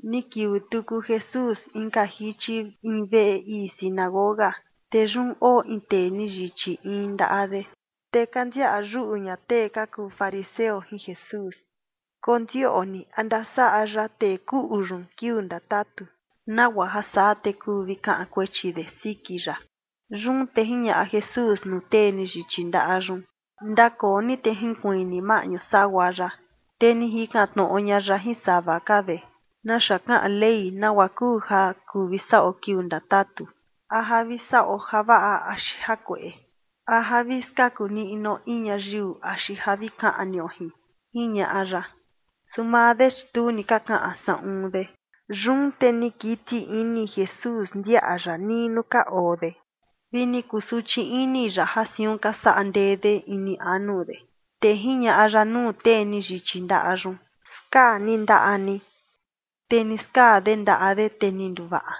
Ni kiuu tuku Jesús inka jichi in veꞌe ii sinagoga, te yun oo in tee ni yichi in ndaꞌa de. Te ka ndiaꞌa yuꞌu ña tee ka kuu fariseo jin Jesús kondioꞌni a ndasaꞌa ya tee kuꞌu yun kiuu ndatatu, nagua ja saa te kuu vi kaꞌan kuechi de siki ya. Yun te jiñaꞌa Jesús nuu tee ni yichi ndaꞌa yun: ―Ndakoo ni, te jinkuiin ni maꞌñu sagua yaꞌa. Te ni jikan tnoꞌo ña ya jin sava ka de: ―¿Naxa kaꞌan Ley nagua kuu ja kuu vi saꞌo kiuu ndatatu? ¿A ja vi saꞌo javaꞌa axi jakueꞌe? ¿A ja vi skaku niꞌnuo in ñayiu axi ja vi kaꞌnio jin? ―jiñaꞌa ya. Su maa de, chi tu ni ka kaꞌan saꞌun de. Yun te ni kiti ini Jesús ndiaꞌa ya nii nuu ka oo de, vi ni kusuchi ini ya ja siun ka saꞌa ndee de ini anu de, te jiñaꞌa ya nuu tee ni yichi ndaꞌa yun: ―Skaa ni ndaꞌa ni. Te ni skaa de ndaꞌa de, te ni nduvaꞌa.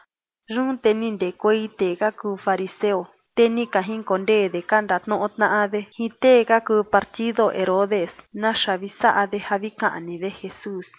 Yun te ni ndekuei tee ka kuu fariseo, te ni ka jinkondee de ka ndatnoꞌo tnaꞌa de jin tee ka yinduu nuu Herodes naxa vi saꞌa de ja vi kaꞌni de Jesús.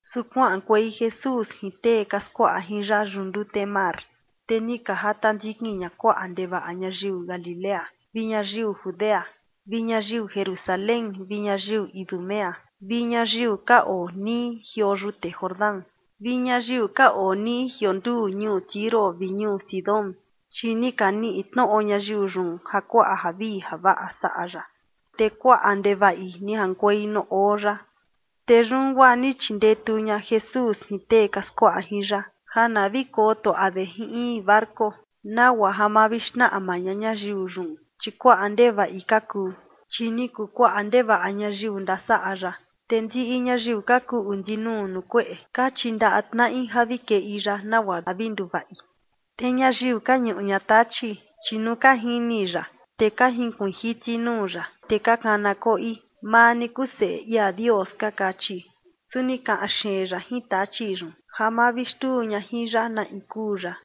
Su kuaꞌankuei Jesús jin tee ka skuaꞌa jin ya yuꞌu ndute mar, te ni ka jata ndikin ña kuaꞌa ndevaꞌa ñayiu Galilea vi ñayiu Judea, vi ñayiu Jerusalén vi ñayiu Idumea vi ñayiu ka oo nii jioo yute Jordán vi ñayiu ka oo nii jionduu ñuu Tiro vi ñuu Sidón, chi ni ka niꞌi tnoꞌo ñayiu yun ja kuaꞌa javii javaꞌa saꞌa ya, te kuaꞌa ndevaꞌi ni jaꞌankuei nuu oo ya. Te yun guaa ni chindetu ña Jesús jin tee ka skuaꞌa jin ya ja na vi kotuaꞌa de jin in barco, nagua ja ma vi xnaꞌma ña ñayiu yun, chi kuaꞌa ndevaꞌi ka kuu. Chi ni kuu kuaꞌa ndevaꞌa ñayiu ndasaꞌa ya, te ndiꞌi ñayiu ka kuꞌu ndinuu nuu kueꞌe ka chindaꞌa tnaꞌi ja vi keꞌi ya, nagua ja vi nduvaꞌi. Te ñayiu ka ñuꞌu ña tachi, chi nuu ka jini ya, te ka jinkuiin jiti nuu ya, te ka kana koꞌi: ―Maa ni kuu Seꞌe ia Dios ―ka kachi. Su ni kaꞌan xeen ya jin tachi yun ja ma vi xtuu ña jin ya na in kuu ya.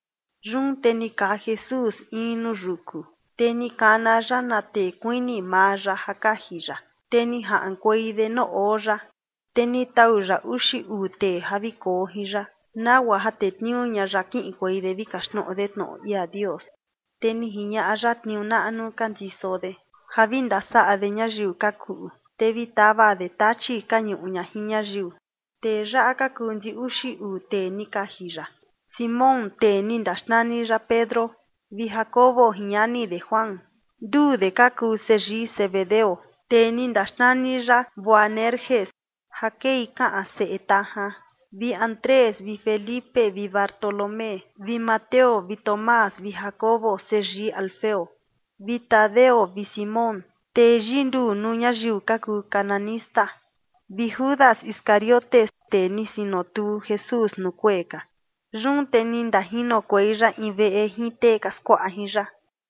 Yun te ni kaa Jesús in nuu yuku, te ni kana ya na tee kuini maa ya ja kaji ya, te ni jaꞌankuei de nuu oo ya. Te ni tau ya uxi uu tee ja vi koo jin ya, nagua ja tetniuu ña ya kiꞌinkuei de vi kaxtnoꞌo de tnoꞌo ia Dios. Te ni jiñaꞌa ya tniuu naꞌnu ka ndiso de ja vi ndasaꞌa de ñayiu ka kuꞌu, te vi tava de tachi ka ñuꞌu ña jin ñayiu. Tee yaꞌa ka kuu ndi uxi uu tee ni kaji ya: Simón tee ni ndaxnani ya Pedro, vi Jacobo jin ñani de Juan, nduu de ka kuu seyii Zebedeo, tee ni ndaxnani ya Boanerges ja kei kaꞌan “seꞌe tajan”, vi Andrés vi Felipe vi Bartolomé vi Mateo vi Tomás vi Jacobo seyii Alfeo, vi Tadeo vi Simón, tee yinduu nuu ñayiu ka kuu cananista, vi Judas Iscariote, tee ni sinotuu Jesús nuu kuee ka. Yun te ni ndajinokuei ya in veꞌe jin tee ka skuaꞌa jin ya.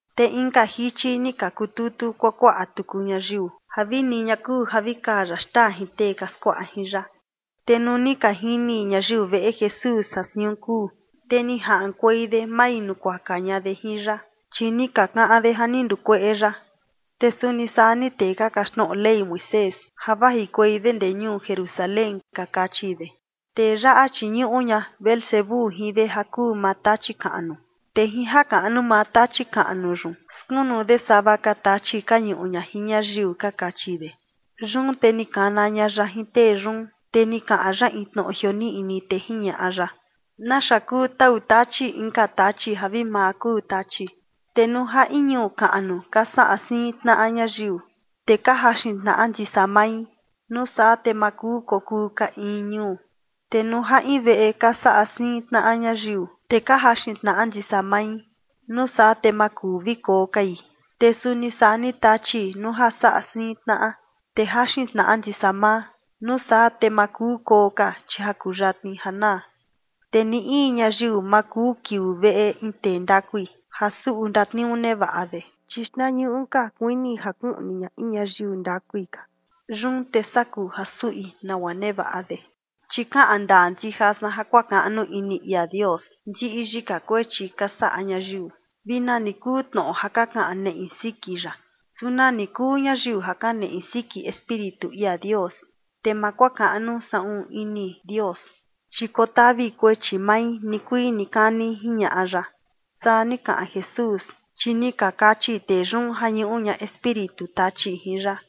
Te inka jichi ni ka kututu kuakuaꞌa tuku ñayiu ja vini ña kuu ja vi kaa ya xtaa jin tee ka skuaꞌa jin ya. Te nuu ni ka jini ñayiu veꞌe Jesús ja siun kuu, te ni jaꞌankuei de mavinukuaka ña de jin ya, chi ni ka kaꞌan de ja ni ndukueꞌe ya. Te suni saa ni tee ka kaxtnoꞌo Ley Moisés ja vajikuei de ndee ñuu Jerusalén, ka kachi de: ―Tee yaꞌa, chi ñuꞌu ña Beelzebú jin de ja kuu maa Tachi kaꞌnu, te jin jakaꞌnu maa Tachi kaꞌnu yun skunu de sava ka tachi ka ñuꞌu ña jin ñayiu ―ka kachi de. Yun te ni kana ña ya jin tee yun, te ni kaꞌan ya in tnoꞌo jioniꞌni, te jiñaꞌa ya: ―¿Naxa kuu tau Tachi inka tachi ja vi maa kuu tachi? Te nuu ja in ñuu kaꞌnu ka saꞌa siin tnaꞌa ñayiu, te ka jaxin tnaꞌa ndisa mai, nuu saa te ma kuu kokuu ka in ñuu. Te nuu ja in veꞌe ka saꞌa siin tnaꞌa ñayiu, te ka jaxin tnaꞌa ndisa mai, nuu saa te ma kuu vi koo kai. Te suni saa ni Tachi, nuu ja saꞌa siin tnaꞌa, te jaxin tnaꞌa ndisa maa, nuu saa te ma kuu koo ka, chi ja kuyatni ja naa. ’Te ni in ñayiu ma kuu kiuu veꞌe in tee ndakui ja suꞌu ndatniuu nevaꞌa de, chi xtnañuꞌu ka kuini ja kuꞌni ña in ñayiu ndakui ka, yun te saa kuu ja suꞌi nagua nevaꞌa de. ’Chi kaꞌan ndaa ndija san ja kuakaꞌnu ini ia Dios ndiꞌi yika kuechi ka saꞌa ñayiu, vi nani kuu tnoꞌo ja ka kaꞌan neꞌi siki ya. Su nani kuu ñayiu ja kaneꞌe siki Espíritu ia Dios, te ma kuakaꞌnu saꞌun ini Dios, chi kotavi kuechi mai nikuii nikani ―jiñaꞌa ya. Saa ni kaꞌan Jesús, chi ni ka kachi tee yun ja ñuꞌu ña espíritu Tachi jin ya.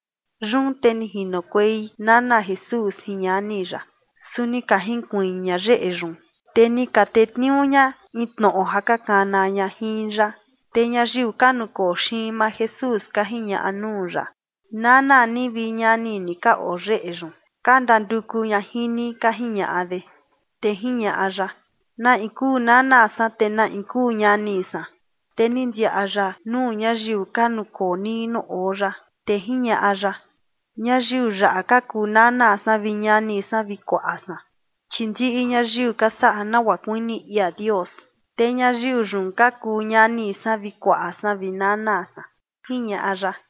Yun te ni jinokuei nana Jesús jin ñani ya, su ni ka jinkuiin ña yeꞌe yun, te ni ka tetniuu ña in tnoꞌo ja ka kana ña jin ya. Te ñayiu ka nukoo xiin maa Jesús ka jiñaꞌa nuu ya: ―Nana ni vi ñani ni ka oo yeꞌe yun, ka ndanduku ña jin ni ―ka jiñaꞌa de. Te jiñaꞌa ya: ―¿Na in kuu nana san, te na in kuu ñani san? Te ni ndiaꞌa ya nuu ñayiu ka nukoo nii nuu oo ya, te jiñaꞌa ya: ―Ñayiu yaꞌa ka kuu nana san vi ñani san vi kuaꞌa san. Chi ndiꞌi ñayiu ka saꞌa nagua kuini ia Dios, te ñayiu yun ka kuu ñani san vi kuaꞌa san vi nana san ―jiñaꞌa ya.